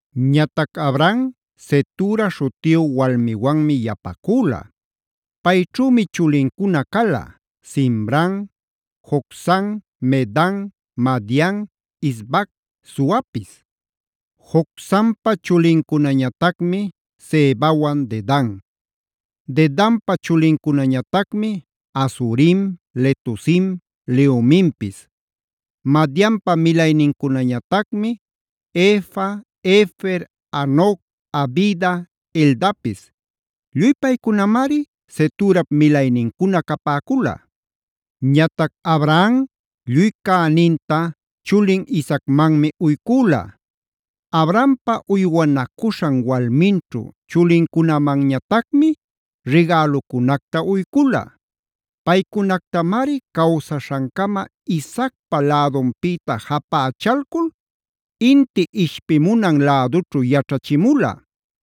Ñatac Abraham Cetura śhutiyu walmiwanmi yapacüla. Payćhümi chulincuna cala: Zimram, Jocsan, Medan, Madian, Isbac, Suapis. Jocsanpa chulincunañatacmi Sebawan Dedan. Dedanpa chulincunañatacmi: Asurim, Letusim, Leumimpis. Madianpa milaynincunañatacmi: Efa, Efer, Hanoc, Abida, Eldapis. Lluy paycunamari Ceturap milaynincuna capäcula. Ñatac Abraham lluy cäninta chulin Isaacmanmi uycüla. Abrahampa uywanacuśhan walminćhu chulincunamanñatacmi rigälucunacta uycula. Paycunactamari cawsaśhancama Isaacpa lädunpïta japächalcul, inti ishpimunan lädućhu yaćhachimula.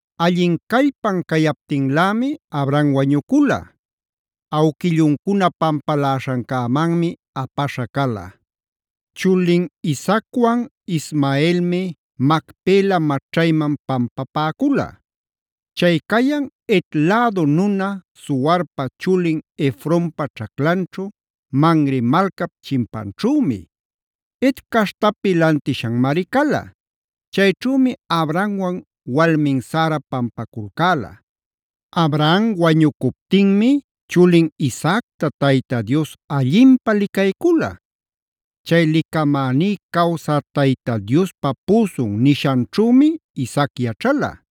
Allin callpan cayaptinlämi Abraham wañucula. Awquilluncuna pampaläśhancämanmi apaśha cala. Chulin Isaacwan Ismaelmi Macpela maćhayman pampapäcula. Chay cayan Het lädu nuna Zoharpa chulin Efronpa ćhaclanćhu, Mamre malcap chimpanćhümi. Het caśhtapi lantishanmari cala.a Chayćhümi Abrahamwan walmin Sara pampaculcäla. Abraham wañucuptinmi chulin Isaacta Tayta Dios allinpä licaycula. Chay “Licamäní cawsä Tayta Diospa püsun” nishanćhümi Isaac yaćhala.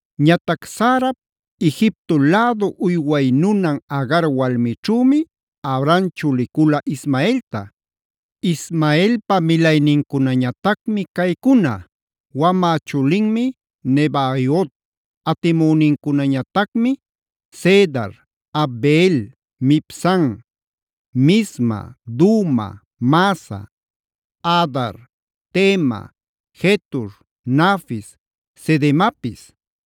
Ñatac Sarap, Egipto lädu uyway nunan Agar walmićhümi Abraham chulicula Ismaelta. Ismaelpa milaynincunañatacmi caycuna: wamä chulinmi Nebaiot, atimünincunañatacmi Cedar, Adbeel, Mibsam, Misma, Duma, Massa, Hadar, Tema, Jetur, Nafis, Cedemapis.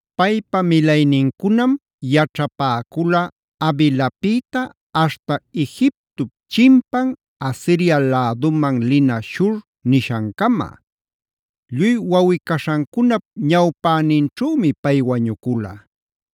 Paypa milaynincunam yaćhapäcula Havilapïta aśhta Egiptop chimpan Asiria läduman lina Shur nishancama. Lluy wawꞌi-caśhancunap ñawpäninćhümi pay wañucula.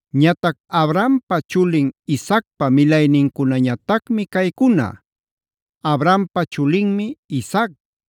Ñatac Abrahampa chulin Isaacpa milaynincunañatacmi caycuna: Abrahampa chulinmi Isaac.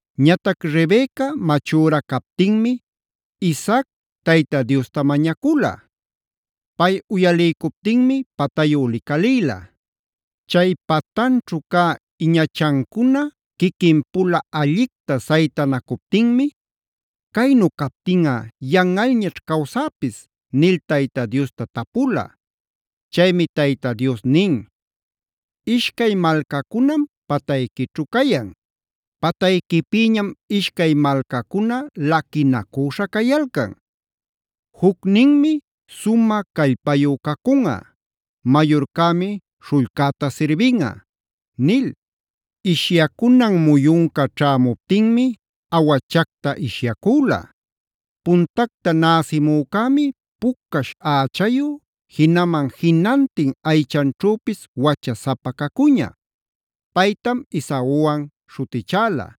Ñatac Rebeca machüra captinmi Isaac Tayta Diosta mañacula. Pay uyaliycuptinmi patayu licalïla. Chay patanćhu cä iñachancuna quiquinpula allicta saytanacuptinmi: “Caynu captinꞌa yanꞌalñaćh cawsäpis” nil Tayta Diosta tapula. Chaymi Tayta Dios nin: “Ishcay malcacunam patayquićhu cayan. Patayquipïñam ishcay malcacuna laquinacüśha cayalcan. Jucninmi sumä callpayu cacunꞌa. Mayurcämi śhullcäta sirbinꞌa”b nil. Ishyacunan muyunca ćhämuptinmi awachacta ishyacüla. Puntacta näsimücämi pucash ächayu, jinaman jinantin aychanćhüpis wachasapa cacuña. Paytam Esauwanc śhutichäla.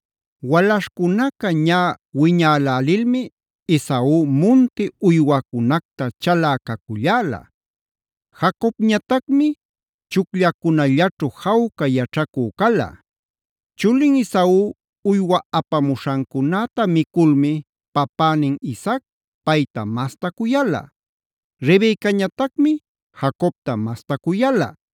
Walaśhcunaca ñä wiñalälilmi Esau munti uywacunacta chalä caculläla. Jacobñatacmi chucllacunallaćhu jawca yaćhacü cala. Chulin Esau uywa apamuśhancunäta miculmi papänin Isaac payta masta cuyala. Rebecañatacmi Jacobta masta cuyala.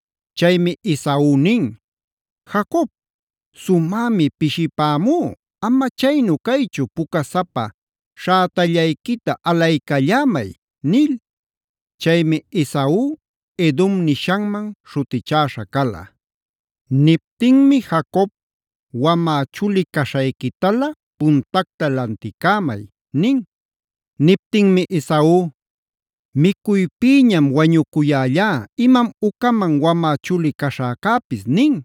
Chaymi Esau nin: “Jacob, sumämi pishipämú, ama chaynu caychu pucasapa śhätallayquita alaycallämay” nil. (Chaymi Esau, Edome nishanman śhutichäśha cala.) Niptinmi Jacob: “Wamä chuli caśhayquitala puntacta lanticämay” nin. Niptinmi Esau: “Micuypïñam wañucuyällá ¿imam ucaman wamä chuli caśhäcäpis?” nin.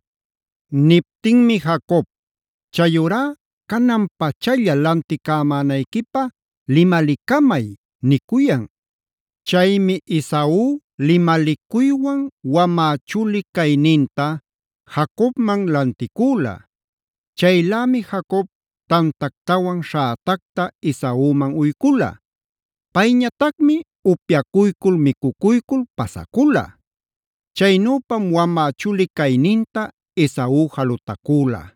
Niptinmi Jacob: “Chayurá canan-pachalla lanticämanayquipä limalicamay” nicuyan.f Chaymi Esau limalicuywan wamä chuli cayninta Jacobman lanticüla. Chaylämi Jacob tantactawan śhätacta Esauman uycula. Payñatacmi upyacuycul micucuycul pasacula. Chaynüpam wamä chuli cayninta Esau jalutacüla.